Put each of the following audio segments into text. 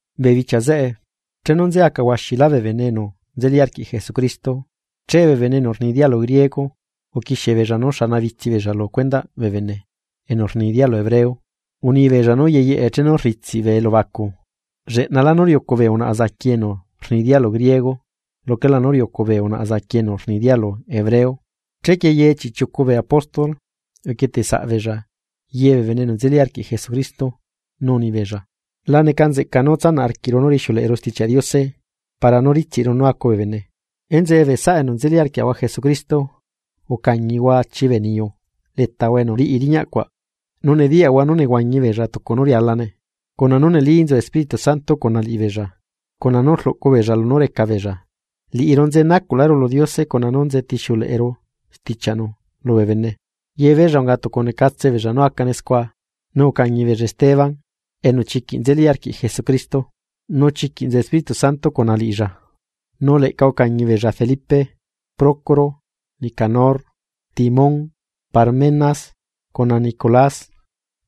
Bee bichia zeꞌe, chenu nze aca huaxilá bee bene enu nzeli arquiꞌ Jesucristo, che bee bene enu rni dialu griego uquixiebeella nú xanabitsi beella lu cuendaꞌ bee bene enu rni dialu hebreo. Unibeella nú yeyeꞌe chenu ritsiꞌ bee elubacu, lleꞌnalá nú riucu bee unaꞌa zaqui enu rni dialu griego luquelá nú riucu bee unaꞌa zaqui enu rni dialu hebreo. Chequie ye chiꞌchiucu bee apóstol uquieteꞌ saꞌbeella ye bee bene enu nzeli arquiꞌ Jesucristo, nu unibeella: ―La necanzeꞌca nú tsanaꞌ arquiꞌru nú rixiuleꞌeru Stichiaꞌ Diose para nú ritsiꞌru nú acu bee bene. Enzeꞌe bee saꞌa enu nzeli arquiaꞌahua Jesucristo, ucañihua achi bee niyu letahua enu riꞌi riñaꞌ cuaꞌ, nu nediyaꞌhua nú nehuañi beella tucu nú rialane, cuna nú neli nzu Espíritu Santo cuna liꞌibeella, cuna nú rluꞌcu beella lunú reca beella. Liꞌiru nzenacuꞌláru lu Diose cuna nú nze tixiuleꞌeru stichiaꞌnu lubee bene. Yebeella unga tucu necatse beella nú acane scua, nu ucañi beella Esteban, enu chiquiꞌ nzeli arquiꞌ Jesucristo, nu chiquiꞌ nzu Espíritu Santo cuna liꞌilla, nu leꞌca ucañi beella Felipe, Procoro, Nicanor, Timón, Parmenas, cuna Nicolás,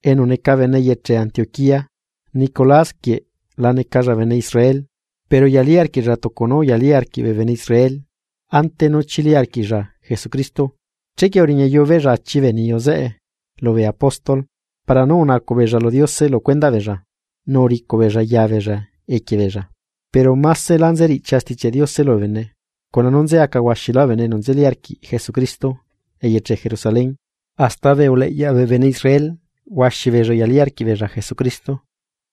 enu neca bene eyeche Antioquía. Nicolás quieꞌ la necalla bene Israel, pero uyalí arquiꞌlla tucu nú uyalí arquiꞌ bee bene Israel ante nú chili arquiꞌlla Jesucristo. Chequie uriñayu beella achi bee niyu zeꞌe lubee apóstol para nú unacuꞌ beella lu Diose lu cuendaꞌ beella nu uricuꞌ beella ya beella equie beella. Pero másela nzeriꞌchia Stichiaꞌ Diose lubee bene, cuna nú nze aca huaxilá bee bene enu nzeli arquiꞌ Jesucristo eyeche Jerusalén, hasta bee uleꞌyaꞌ bee bene Israel huaxi beella uyalí arquiꞌbeella Jesucristo.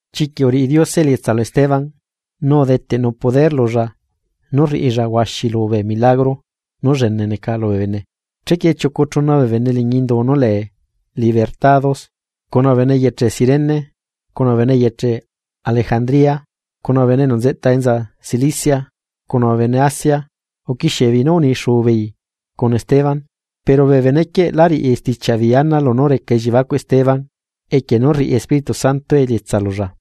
Chiquiꞌ uriꞌi Diose elietsa lu Esteban, nu udeteꞌnu poder lulla nú rriꞌilla huaxilu bee milagro nú llene neca lubee bene. Chequie chiucu chuna bee bene liñi indu nú lee Esclavos Libertados, cuna bee bene eyeche Cirene, cuna bee bene eyeche Alejandría, cuna bee enu nzeꞌta enza Cilicia, cuna bee bene Asia, uquixiebeei nú unixu beei cuna Esteban. Pero bee benequieꞌ lá riꞌi stichiaꞌ beei ana lunú reca elliebacuꞌ Esteban, equie nú rriꞌi Espíritu Santo elietsa lulla.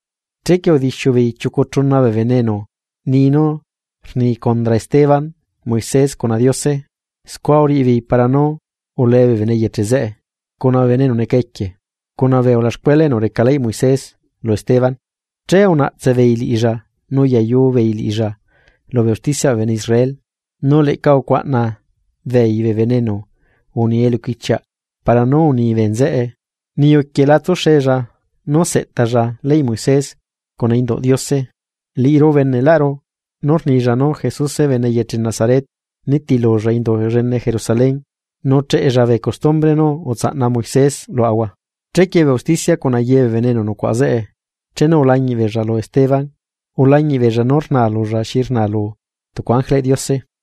Chequie udixiu beei chiucu chuna bee bene enu ni nú rni condra Esteban Moisés cuna Diose. Scua uriꞌibeei para nú ulee bee bene eyeche zeꞌe, cuna bee bene enu neca equie, cuna bee ulaxcuela enu reca leyꞌ Moisés lu Esteban. Che unaꞌtse beei liꞌilla nu uyayu beei liꞌilla lubee ustichiaꞌ bee bene Israel. Nu leꞌca ucuaꞌna beei bee bene enu uni eluquichiaꞌ para nú uni bee nzeꞌe: ―Niyu quieꞌ la tsuxella nú seꞌtalla leyꞌ Moisés cuna induꞌ Diose. Liꞌiru ubeneꞌru nú rnilla nú Jesuse bene eyeche Nazaret nitilulla indu llene Jerusalén, nu cheꞌella bee custumbre nú utsaꞌna Moisés luaꞌahua. Chequie bee usticia cuna ye bee bene enu nucuaꞌa zeꞌe, chenu ulañiꞌbeella lu Esteban, ulañiꞌbeella nú rnaa lulla xi rnaa lu tucu ángeleꞌ Diose.